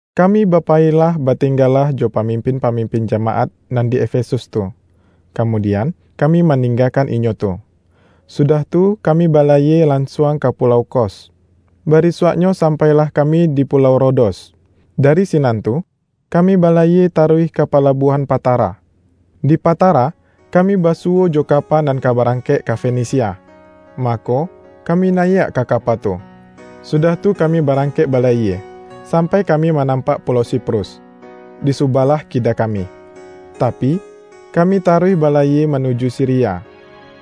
Kami bapayilah batinggalah jo pamimpin-pamimpin jamaat nan di Efesus tu, kamudian kami maninggakan inyo tu. Sudah tu, kami balayie lansuang ka pulau Kos; barisuaknyo sampailah kami di pulau Rodos. Dari sinan tu kami balayie taruih ka palabuahan Patara. Di Patara, kami basuwo jo kapa nan ka barangkek ka Fenisia. Mako, kami nayiak ka kapa tu, sudah tu kami barangkek balayie, sampai kami manampak pulau Siprus, di subalah kida kami; tapi, kami taruih balayie manuju Siria.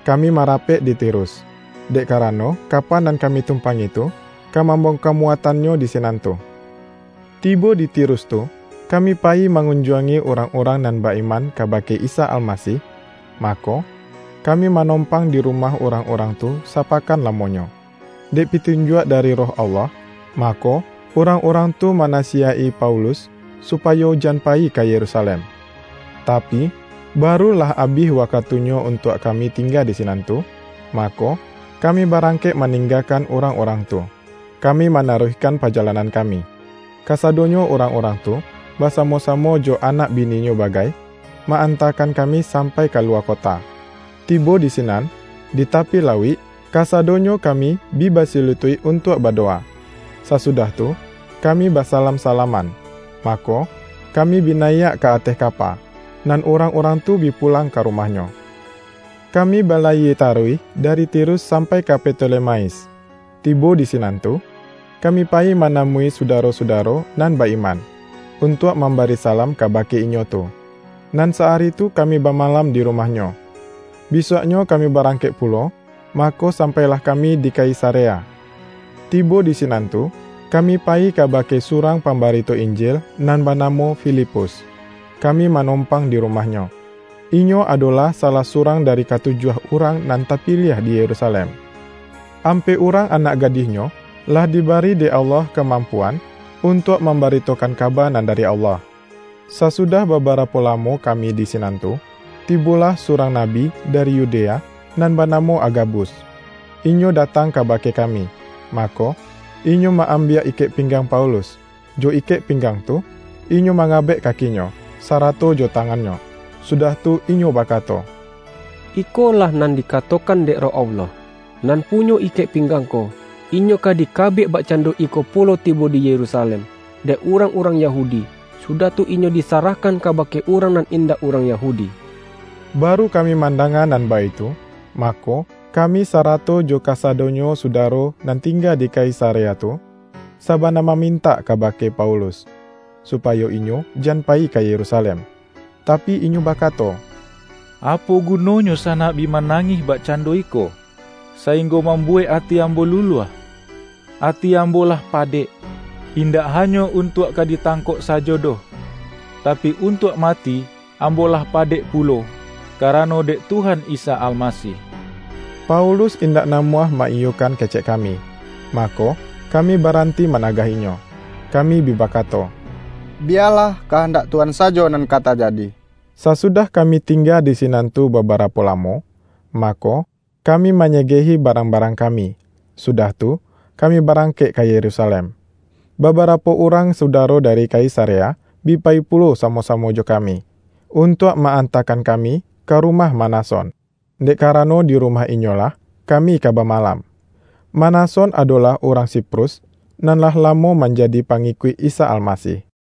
Kami marapek di Tirus, dek karano kapa nan kami tumpangi tu ka mambongka muatannyo di sinan tu. Tibo di Tirus tu, kami payi mangunjuangi urang-urang nan ba-iman kabake Isa Almasih, mako, kami manompang di rumah urang-urang tu sapakan lamonyo. Dek pitunjuak dari Roh Allah, mako urang-urang tu manasiyaik-i Paulus, supayo jan payi ka Yerusalem. Tapi, baru lah abih wakatunyo untuak kami tingga di sinan tu, mako, kami barangkek maninggakan urang-urang tu, kami manaruihkan pajalanan kami. Kasadonyo urang-urang tu, basamo-samo jo anak bininyo bagai, ma-antakan kami sampai ka luwa kota. Tibo di sinan, di tapi lauik, kasadonyo kami bi basilutuik untuak badowa. Sasudah tu kami basalam-salaman, mako, kami bi nayiak ka ateh kapa, nan urang-urang tu bi pulang ka rumahnyo. Kami balayie taruih dari Tirus sampai ka Ptolemais. Tibo di sinan tu, kami payi manamui sudaro-sudaro nan ba-iman, untuak mambari salam kabake inyo tu, nan sa-ari tu kami bamalam di rumahnyo. Bisuaknyo kami barangkek pulo, mako sampailah kami di Kaisarea. Tibo di sinan tu, kami payi kabake surang pambarito Injil nan banamo Filipus, kami manompang di rumahnyo. Inyo adolah salah surang dari katujuah urang nan tapiliah di Yerusalem. Ampek urang anak gadihnyo, lah dibari dek Allah kamampuan untuak mambaritokan kaba nan dari Allah. Sasudah babarapo lamo kami di sinan tu, tibolah surang nabi dari Yudea nan banamo Agabus. Inyo datang kabake kami, mako, inyo ma-ambiak ikek pinggang Paulus. Jo ikek pinggang tu, inyo mangabek kakinyo, sarato jo tangannyo, sudah tu inyo bakato,”Ikolah nan dikatokan dek Roh Allah: Nan punyo ikek pinggang ko, inyo ka dikabek bakcando iko pulo tibo di Yerusalem, dek urang-urang Yahudi, sudah tu inyo disarahkan kabake urang nan indak urang Yahudi.” Baru kami mandanga nan baitu, mako, kami sarato jo kasadonyo sudaro nan tingga di Kaisarea tu, sabana mamintak kabake Paulus, supayo inyo jan payi ka Yerusalem. Tapi, inyo bakato,”Apo gunonyo sanak bi manangih bakcando iko, sainggo mambuwek ati ambo luluah? Ati ambo lah padek, indak hanyo untuak ka ditangkok sajo doh, tapi, untuak mati ambo lah padek pulo, karano dek Tuhan Isa Almasih.” Paulus indak namuah ma-iyokan kecek kami, mako, kami baranti managah inyo. Kami bi bakato,”Biyalah kahandak Tuhan sajo nan ka tajadi.” Sasudah kami tingga di sinan tu babarapo lamo, mako, kami manyegehi barang-barang kami, sudah tu kami barangkek ka Yerusalem. Babarapo urang sudaro dari Kaisarea, bi payi pulo samo-samo jo kami, untuak ma-antakan kami ka rumah Manason, dek karano di rumah inyolah kami ka bamalam. (Manason adolah urang Siprus nan lah lamo manjadi pangikuik Isa Almasih.)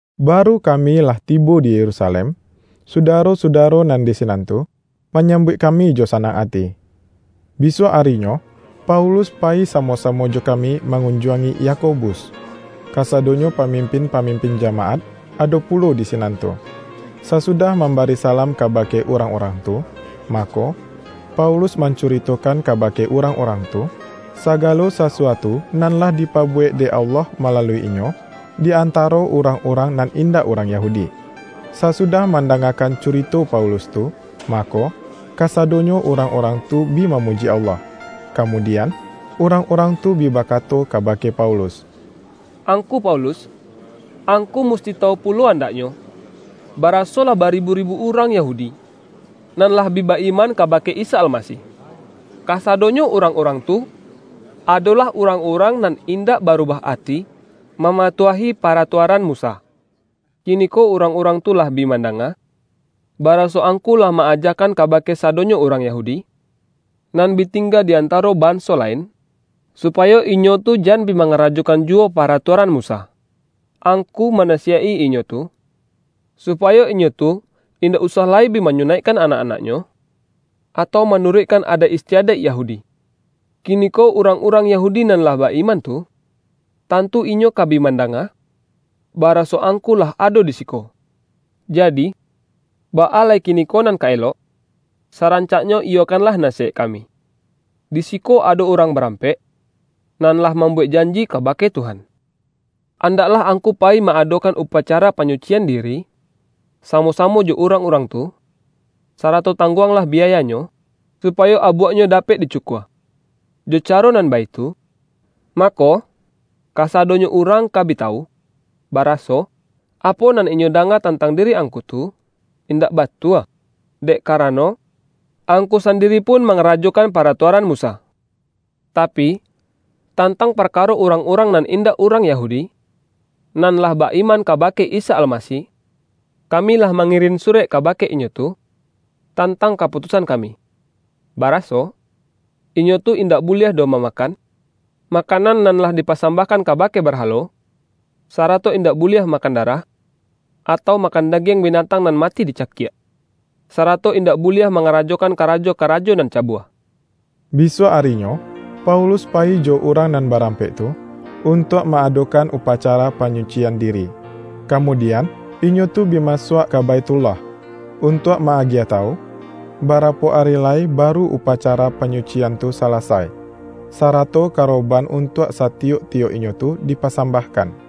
Baru kami lah tibo di Yerusalem, sudaro-sudaro nan di sinan tu, manyambuik kami jo sanang ati. Bisuak arinyo, Paulus payi samo-samo jo kami mangunjuangi Yako-bus; kasadonyo pamimpin-pamimpin jamaat ado pulo di sinan tu. Sasudah mambari salam kabake urang-urang tu, mako, Paulus mancuritokan kabake urang-urang tu, sagalo sasuatu nan lah dipabuwek dek Allah malalui inyo, di antaro urang-urang nan indak urang Yahudi. Sasudah mandangakan curito Paulus tu, mako, kasadonyo urang-urang tu bi mamuji Allah. Kamudian urang-urang tu bi bakato kabake Paulus,”Angku Paulus! Angku musti tawu pulo andaknyo, baraso lah baribu-ribu urang Yahudi, nan lah bi ba-iman kabake Isa Almasih. Kasadonyo urang-urang tu adolah urang-urang nan indak barubah ati mamatuahi paratuaran Musa. Kiniko urang-urang tu lah bi mandanga, baraso angku lah ma-ajakan kabake sadonyo urang Yahudi, nan bi tingga di antaro banso lain, supayo inyo tu jan bi mangarajokan juwo paratuaran Musa. Angku manasiyaik-i inyo tu, supayo inyo tu indak usah lai bi manyunaikkan anak-anaknyo, atau manuruikkan adaik istiadaik Yahudi. Kiniko urang-urang Yahudi nan lah ba-iman tu, tantu inyo ka bi mandanga, baraso angku lah ado di siko. Jadi, baa lai kiniko nan ka elok? Sarancaknyo iyokanlah nasiyaik kami. Di siko ado urang barampek, nan lah mambuwek janji kabake Tuhan. Andaklah angku payi ma-adokan upacara panyucian diri, samo-samo jo urang-urang tu, sarato tangguanglah biayanyo, supayo abuaknyo dapek dicukua. Jo caro nan baitu, mako, kasadonyo urang ka bi tawu, baraso, apo nan inyo danga tantang diri angku tu, indak batua, dek karano angku sandiri pun mangarajokan paratuaran Musa. Tapi, tantang parkaro urang-urang nan indak urang Yahudi, nan lah ba-iman kabake Isa Almasih, kami lah mangirin surek kabake inyo tu tantang kaputusan kami, baraso, inyo tu indak buliah doh mamakan, makanan nan lah dipasambahkan kabake barhalo, sarato indak buliah makan darah, atau makan dagiang binatang nan mati dicakiak; sarato indak buliah mangarajokan karajo-karajo nan cabua.” Bisuak arinyo, Paulus payi jo urang nan barampek tu, untuak ma-adokan upacara panyucian diri. Kamudian, inyo tu bi masuak ka Baithullah, untuak ma-agiah tawu, barapo ari lai baru upacara panyucian tu salasai, sarato karoban untuak satiyok-tiyok inyo tu dipasambahkan.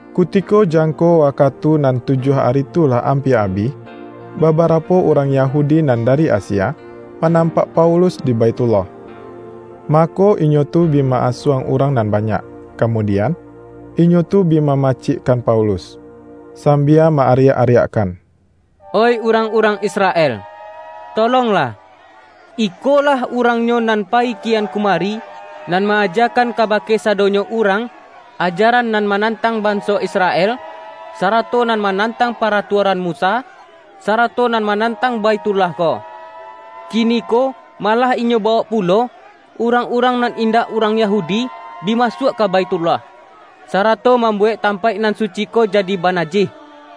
Kutiko jangko wakatu nan tujuah ari tu lah ampia abih, babarapo urang Yahudi nan dari Asia, manampak Paulus di Baithullah. Mako, inyo tu bi ma-asuang urang nan banyak, kamudian, inyo tu bi mamacikkan Paulus, sambia ma-ariak-ariakkan,”Oih urang-urang Israel, tolonglah! Ikolah urangnyo nan payi kian kumari, nan ma-ajakan kabake sadonyo urang, ajaran nan manantang banso Israel, sarato nan manantang paratuaran Musa, sarato nan manantang Baithullah ko. Kiniko malah inyo bawok pulo, urang-urang nan indak urang Yahudi, bi masuak ka Baithullah, sarato mambuwek tampaik nan suci ko jadi banajih!” (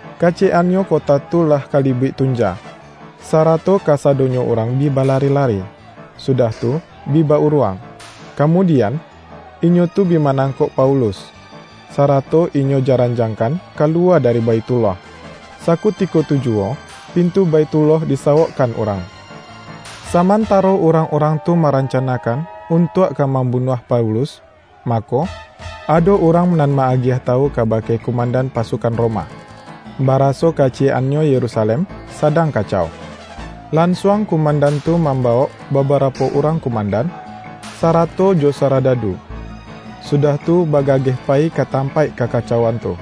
Kaciyek-annyo kota tu lah kalibuik tunja, sarato kasadonyo urang bi balari-lari, sudah tu bi ba-uruang. Kamudian, inyo tu bi manangkok Paulus, sarato inyo jaranjangkan kaluwa dari Baithullah. Sakutiko tu juwo pintu Baithullah disawokkan urang. Samantaro urangurang tu marancanakan untuak ka mambunuah Paulus, mako, ado urang nan ma-agiah tawu kabake kumandan pasukan Roma, baraso kaciyek-annyo Yerusalem sadang kacau. Lansuang kumandan tu mambawok babarapo urang kumandan, sarato jo saradadu, sudah tu bagageh payi ka tampaik kakacauan tu.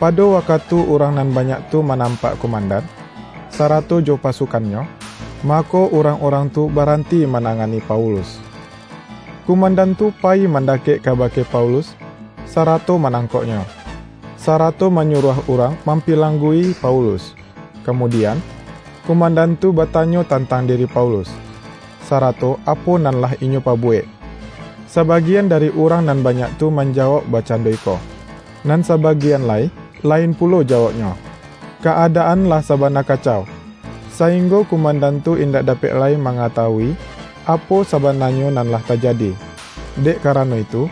Pado wakatu urang nan banyak tu manampak kumandan, sarato jo pasukannyo, mako, urang-urang tu baranti manangani Paulus. Kumandan tu payi mandakek kabake Paulus sarato manangkoknyo, sarato manyuruah urang mampilanggui Paulus. Kamudian, kumandan tu batanyo tantang diri Paulus, sarato apo nan lah inyo pabuwek. Sabagian dari urang nan banyak tu manjawauk bakcando iko, nan sabagian lai lain pulo jawauknyo. Ka-adaan lah sabana kacau, sainggo kumandan tu indak dapek lai mangatawui, apo sabananyo nan lah tajadi. Dek karano itu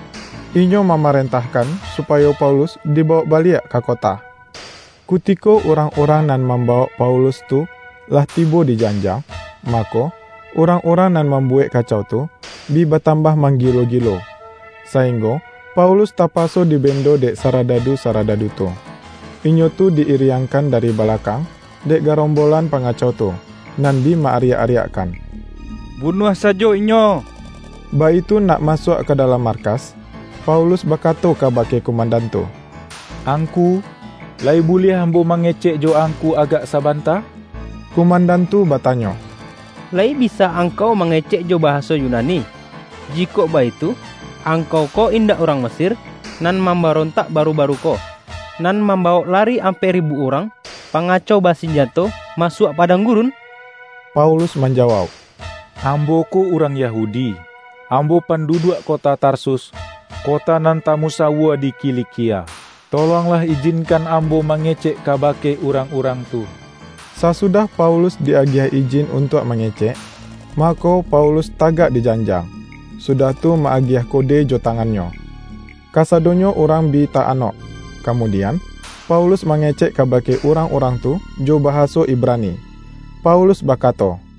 inyo mamarentahkan supayo Paulus dibawok baliak ka kota. Kutiko urang-urang nan mambawok Paulus tu, lah tibo di janjang, mako, urang-urang nan mambuwek kacau tu, bi batambah manggilo-gilo, sainggo Paulus tapaso dibendo dek saradadu-saradadu tu. Inyo tu di-iriangkan dari balakang, dek garombolan pangacau tu, nan bi ma-ariak-ariakkan,”Bunuah sajo inyo!” Baitu nak masuak ka dalam markas, Paulus bakato kabake kumandan tu,”Angku, layi buliah ambo mangecek jo angku agak sabanta?” Kumandan tu batanyo,”Layi bisa angkau mangecek jo bahaso Yunani? Jikok baitu, angkau ko indak urang Mesir nan mambarontak baru-baru ko, nan mambawok lari ampek ribu urang pangacau basinjato, masuak padang gurun?” Paulus manjawauk,”Ambo ko urang Yahudi; ambo panduduak kota Tarsus, kota nan tamusawua di Kilikia. Tolonglah ijinkan ambo mangecek kabake urang-urang tu.” Sasudah Paulus di-agiah ijin untuak mangecek, mako, Paulus tagak dijanjang, sudah tu ma-agiah kodejo tangannyo. Kasadonyo urang bi ta-anok. Kamudian, Paulus mangecek kabake urang-urang tu jo bahaso Ibrani. Paulus bakato, RIWAYAIK RASUL-RASUL